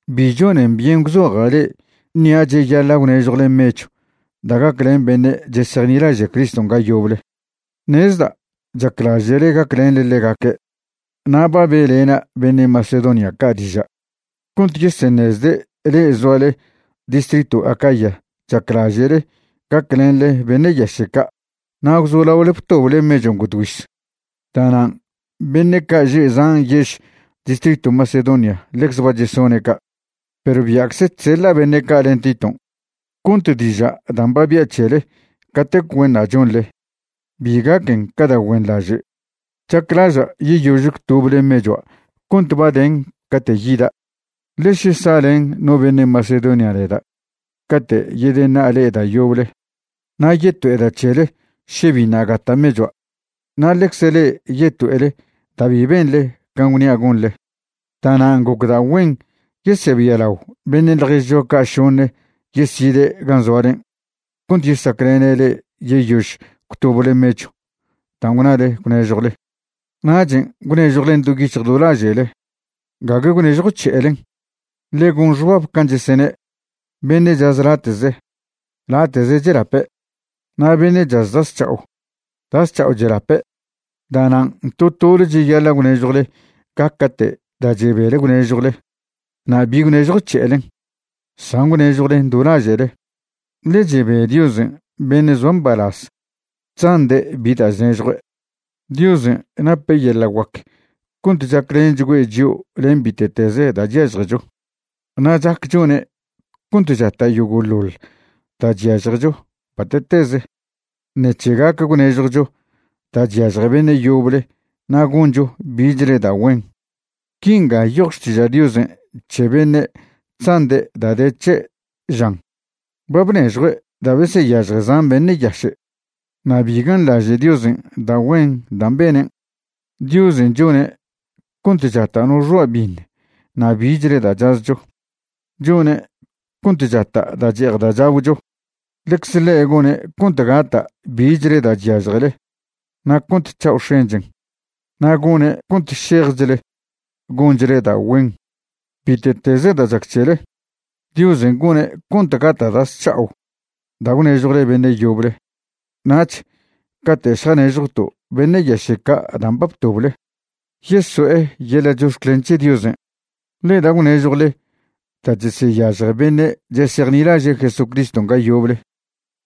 Bi chonen byen gwzoja' le'e ṉia' cheyaḻa' gwnežjwle mechw da' gaclen beṉe' chesejnilaže' Criston' ga yoble. Ṉezda' chaclaže'le gaclenḻe ḻegaque'. Na' ba be'lena' beṉe' Macedonia ca' diža' cont yeseṉezde' le'e zoale distritw Acaya chaclaže'le gaclenḻe beṉe' yaše' ca' na' gwzolaole btoble mechon' godgüiz. Da'nan' beṉe' ca' že' zan yež distritw Macedonia ḻecze ba chesone' ca'. Perw bia'cze chseḻa' beṉe' ca' len Titon' cont diža' dan' ba bia' c̱hele catec güenṉa' chonḻe bi gaquen ca da' güenḻaže'. Chaclaža' yeyož gwtoble mechua' cont ba den cate' yida'. Ḻe še sa'len no beṉe' Macedonia neda' cate' yedeṉa'a le'e da' yoble, na' yeto'eda' c̱hele še biṉa' gata' mechua', na' ḻecze le'e yeto'ele da' bi benḻe can' gwnia' gonḻe. Da'nan' gocda' güen yesebialao beṉe' ḻježcho ca' šoṉe yeside' gan' zoalen' cont yesaclene' le'e yeyož gwtoble mechw dan' gwnale gwnežjwle. Nachen' gwnežjwlen do yic̱hj do laže'le, gague gwnežjwc̱he'elen. Ḻe gon xbab can' chesene': “Beṉe' chaz late'ze, late'ze chelape', na' beṉe' chaz da' zc̱ha'o, da' zc̱ha'o chelape'.” Da'nan' to tole cheyaḻa' gwnežjwle gaca'te' da' chebele gwnežjwle, na' bi gwnežjwc̱he'elen, san gwnežjwlen do laže'le, ḻe chebe Diosen' beṉe' zoa mbalaz chzande' bi da' chnežjue'. Diosen' nape' yeḻa' guac cont chaclenchgüe' chio' len bite'teze da' chyažjecho. Na' chac chone' cont chata' yogo'ḻoḻ da' chyažjecho bate'teze ṉec̱he gac gwnežjwcho da' chyažje beṉe' yoble na' goncho bichle da' güen. Quinga nyoj Xtiža' Diosen' c̱he beṉe' chzande' da' de c̱he', žan: Ba bnežjue' da' beseyažje zan beṉe' yaše'. Na' bi ganḻaže' Diosen' da' güen dan' benen'. Diosen' chone' cont chata' no xoa' biṉ na' bichle da' chazcho; chone' cont chata' da' che'ej da' chagwcho. Ḻecze ḻe' gone' cont gata' bichle da' chyažjele na' cont c̱ha'o x̱enchen, na' gone' cont šejchle gonchle da' güen. Bite'teze da' chac c̱hele, Diosen' gone' cont gata' da' zc̱ha'o da' gwnežjwle beṉe' yoble. Nach cate' šjanežjwto' beṉe' yaše' ca' dan' ba btoble, yeso'e yeḻa' chox̱clen c̱he Diosen'. Ḻe da' gwnežjwle da' cheseyažje beṉe' chesejnilaže' Jesucriston' ga yoble,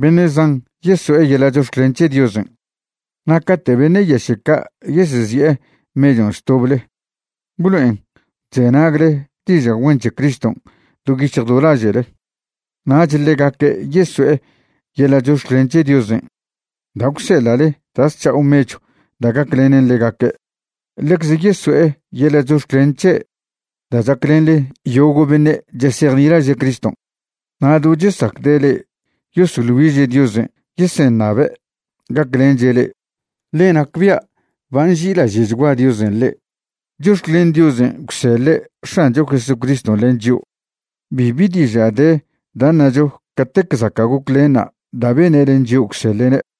beṉe' zan yeso'e yeḻa' chox̱clen c̱he Diosen'. Na' cate' beṉe' yaše' ca' yesezi'e mechon' chtoble, gwlo'en chzenagle diža' güen c̱he Criston' do yic̱hj do laže'le. Nach ḻegaque' yeso'e yeḻa' chox̱clen c̱he Diosen' da' gwseḻa'le da' zc̱ha'o mechw da' gaclenen ḻegaque'. Ḻecze yeso'e yeḻa' chox̱clen c̱he' da' chaclenḻe yogo' beṉe' chesejnilaže' Criston'. Na' do chesacde' le'e yosoḻ güiže' Diosen' yeseṉabe' gaclenche' le'e, ḻe nacbia' ba nži'ilaže'chgua Diosen' le'e. Chox̱clen Diosen' gwseḻe' X̱ancho Jesucriston' len chio'. Bibi diža' de da' ṉacho catec zaca' goclenṉa' da' bene' len chio' gwseḻe'ne'.